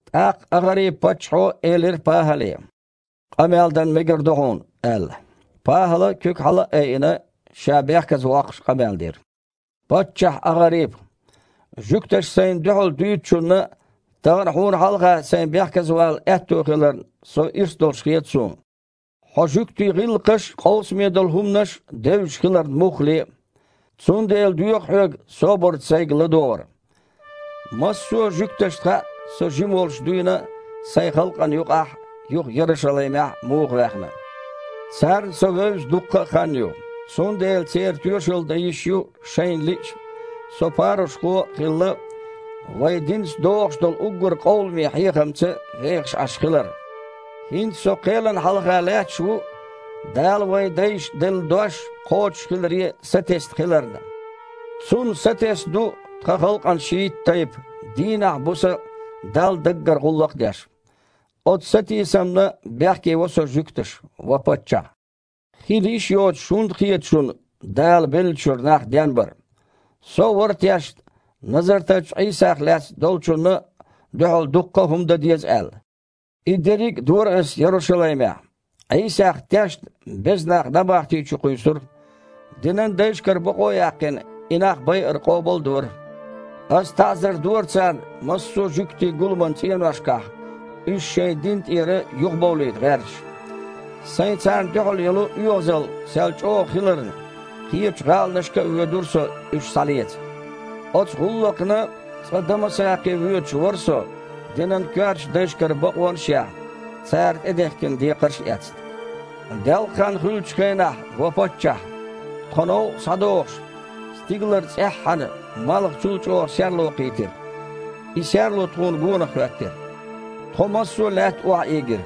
ТІаккха АгІарипа-паччахьо элира ПахІале: «Къамел дан мегар ду хьуна», – аьлла. ПахІала, куьг хьала а айина, ша бехказавоккхуш къамел дира: «Паччахь АгІарипа! Жуьгташа сайна дуьхьал дуьйцучунна тахана хьуна хьалха сайн бехказавала аьтто хиларна со ирс долуш хета суна, хьо жуьгтийн гІиллакхаш а, къовсаме долу хІуманаш а девзаш хиларна муххале а. Цундела доьху хьоьга собарца сайга ладогІар. Массо а жуьгташна хаьа, со жима волуш дуьйна а сайн халкъана юкъахь а, юха Ярушалаймехь а муха ваьхна. Царна со вевза дуккха а хан ю, цундела церан тоьшалла дан йиш ю, шайна лиъча, со парушхо а хилла, вайн динаца догІуш долу уггар къовламе хьехамца вехаш Іаш хилар. ХІинца со кхелана хьалха лаьтташ ву, Дала вайн дайшна делла дош кхочушхиларе сатесна хиларна. Цунна сатесна ду тхан халкъан шийтта тайпа, дийнахь а, буса а Далла даггара гІуллакх а деш. Оцу сатийсамна бехкево со жуьгташа, ва паччахь. Хила йиш йоцуш хІунда хета шуна Дала беллачуьра нах денбар? Со а вара тешна, Назартарчу Іийсах лаьцна долчунна дуьхьал дуккха а хІума дан деза аьлла. И дерриг а дора ас Ярушалаймехь: Іийсах тешна беза нах набахти чу кхуьйсура, динан дайшкара бакъо а яьккхина, и нах байар къобал а дора. Ас таІзар дора царна массо а жуьгтийн гуламан цІеношкахь, уьш шайн дина тІера юхабовлийта гІерташ. Сайн царна дуьхьал йолу оьгІазалла сел чІогІа хиларна, кхечу гІаланашка а воьдура со уьш схьалеца». «Оцу гІуллакхна цкъа Дамасакхе воьдуш вара со, динан коьртачу дайшкара бакъонаш а яьхна, цара тІедехкина декхарш а эцна. Делкъахан хуьлучу хенахь, ва паччахь, тхо новкъа схьадогІуш, стигалара цІеххьана малхачул а чІогІа серло кхийтира. И серло тхуна гонах хІоьттира. Тхо массо а лаьтта охьаийгира.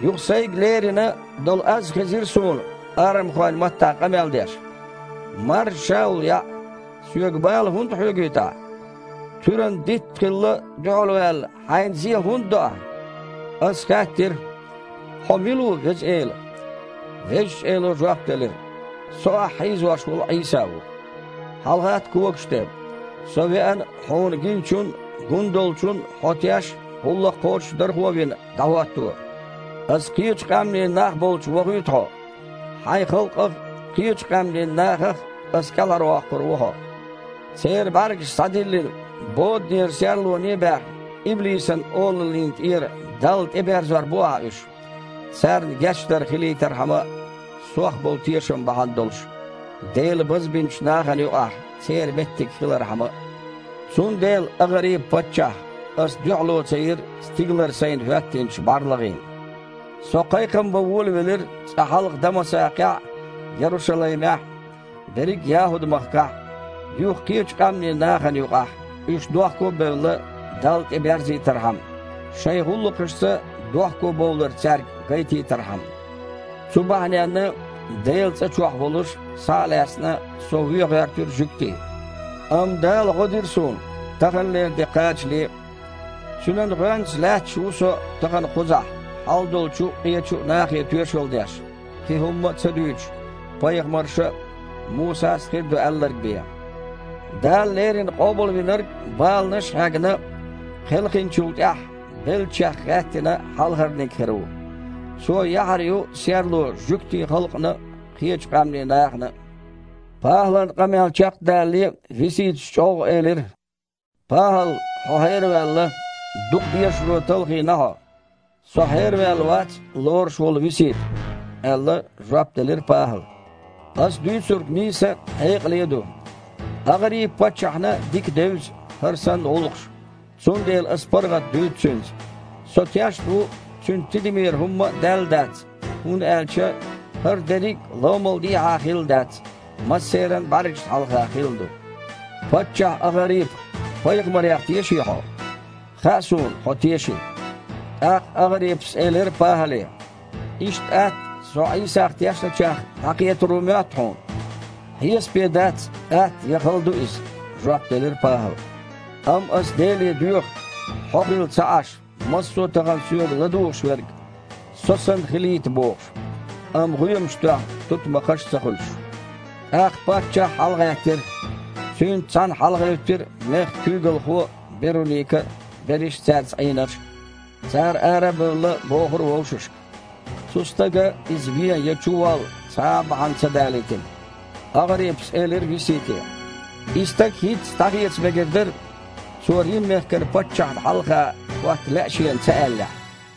Юха сайга лерина долу аз хезира суна, арамхойн маттахь къамел деш: „Маржа Шаул яІ! Соьга бала хІунда хьоьгуьйту ахь? Туьран дитт а хилла дуьхьалваьлла, хьайна зе хІунда до ахь?“ Ас хаьттира: „Хьо мила ву, Веза Эла?“ Везачу Эло жоп делира: „Со ахь хьийзош волу Іийса ву. ХьалагІатта когаш тІе. Со веана, хьуна гиначун а, гун долчун а хьо теш а, гІуллакх кхочушдархо а вина, дІахІотто. Ас кхечу къаьмнийн нах болчу вохуьйту хьо. Хьайн халкъах а, кхечу къаьмнийн нахах а Ас кІелхьарвоккхур ву хьо. Церан бІаьргаш схьадиллина, боданера серлоне а баьхна, иблисан олаллина тІера Далла тІеберзор бу ахь уьш, царна гечдар хилийтархьама а, Сох болу тешам бахьана долуш, Делан базбинчу нахана юкъахь церан меттиг хилархьама а“». «Цундела, АгІарипа-паччахь, ас дуьхьало ца йира стигалара сайна хІоьттинчу бІарлагІина. Со кхайкхам бан волавелира цкъа хьалха Дамасакхехь а, Ярушалаймехь а, берриг а ЯхІуд-махкахь а, юха кхечу къаьмнийн нахана юкъахь, уьш дохко а бевлла, Далла тІе берзийтархьама, шайн гІуллакхашца дохкобовлар цаьрга гайтийтархьама. Цу бахьаненна, Делан цІа чохь волуш, схьа а лаьцна, со вен гІоьртира жуьгтий. Амма Дала гІо дира суна, таханалера де кхачале а. Цуьнан гІоьнца лаьтташ ву со тахана кхузахь хьалдолчу а, къечу а нахе тоьшалла деш, кхин хІумма а ца дуьйцуш, пайхамарша а, Мусас а хир ду аьлларг бен: Дала леррина Къобалвинарг, баланаш а хьегна, кхелхинчул тІаьхьа, беллачех гІаьттина хьалхарниг хир ву. Цо яхьар ю серло жуьгтийн халкъана а, кхечу къаьмнийн нахана а». ПахІалан къамел чекхдалале Виситас чІоггІа элира: «ПахІал, хьо хьераваьлла! Дукха дешаро талхийна хьо!» «Со хьераваьлла вац, лоруш волу Висита, – аьлла, жоп делира ПахІала. – Ас дуьйцург нийса а, хьекъале а ду. АгІарипа-паччахьна дика девза хІара санна гІуллакхаш, цундела ас паргІат дуьйцу цуьнца. Со тешна ву, цуьнан тидамера хІумма а даьлла дац, хІунда аьлча хІара дерриг а ломал дехьа хилла дац, массеран а бІаьргашна хьалха хилла ду. Паччахь АгІарипа, пайхамарех теший хьо? Хаьа суна, хьо теший». ТІаккха АгІарипас элира ПахІале: «Иштта атта со Іийсах тешначех дІакхетар ву моьтту хьуна?» «Хьесапе дац, атта я хала ду иза, – жоп делира ПахІала, – амма ас Деле доьху, хьо хилла ца Іаш, массо а тахана соьга ладугІушверг, со санна, хилийта бохуш, амма гІоьмаш тоьхна тутмакхаш ца хуьлуш». ТІаккха паччахь хьалагІаьттира, цуьнца цхьаьна хьалагІевттира мехкан куьйгалхо а, Беруника а, берриш а цаьрца Іийнарш а. Цара, ара а бевлла, бохура вовшашка: «Цу стага иза вен я чуволла цхьа а бахьана ца далийтина». АгІарипас элира Висите: «И стаг хІинцца дІахеца мегар дара, цо Рим-мехкан паччахьна хьалха хІотта лаьа шена ца аьллехь».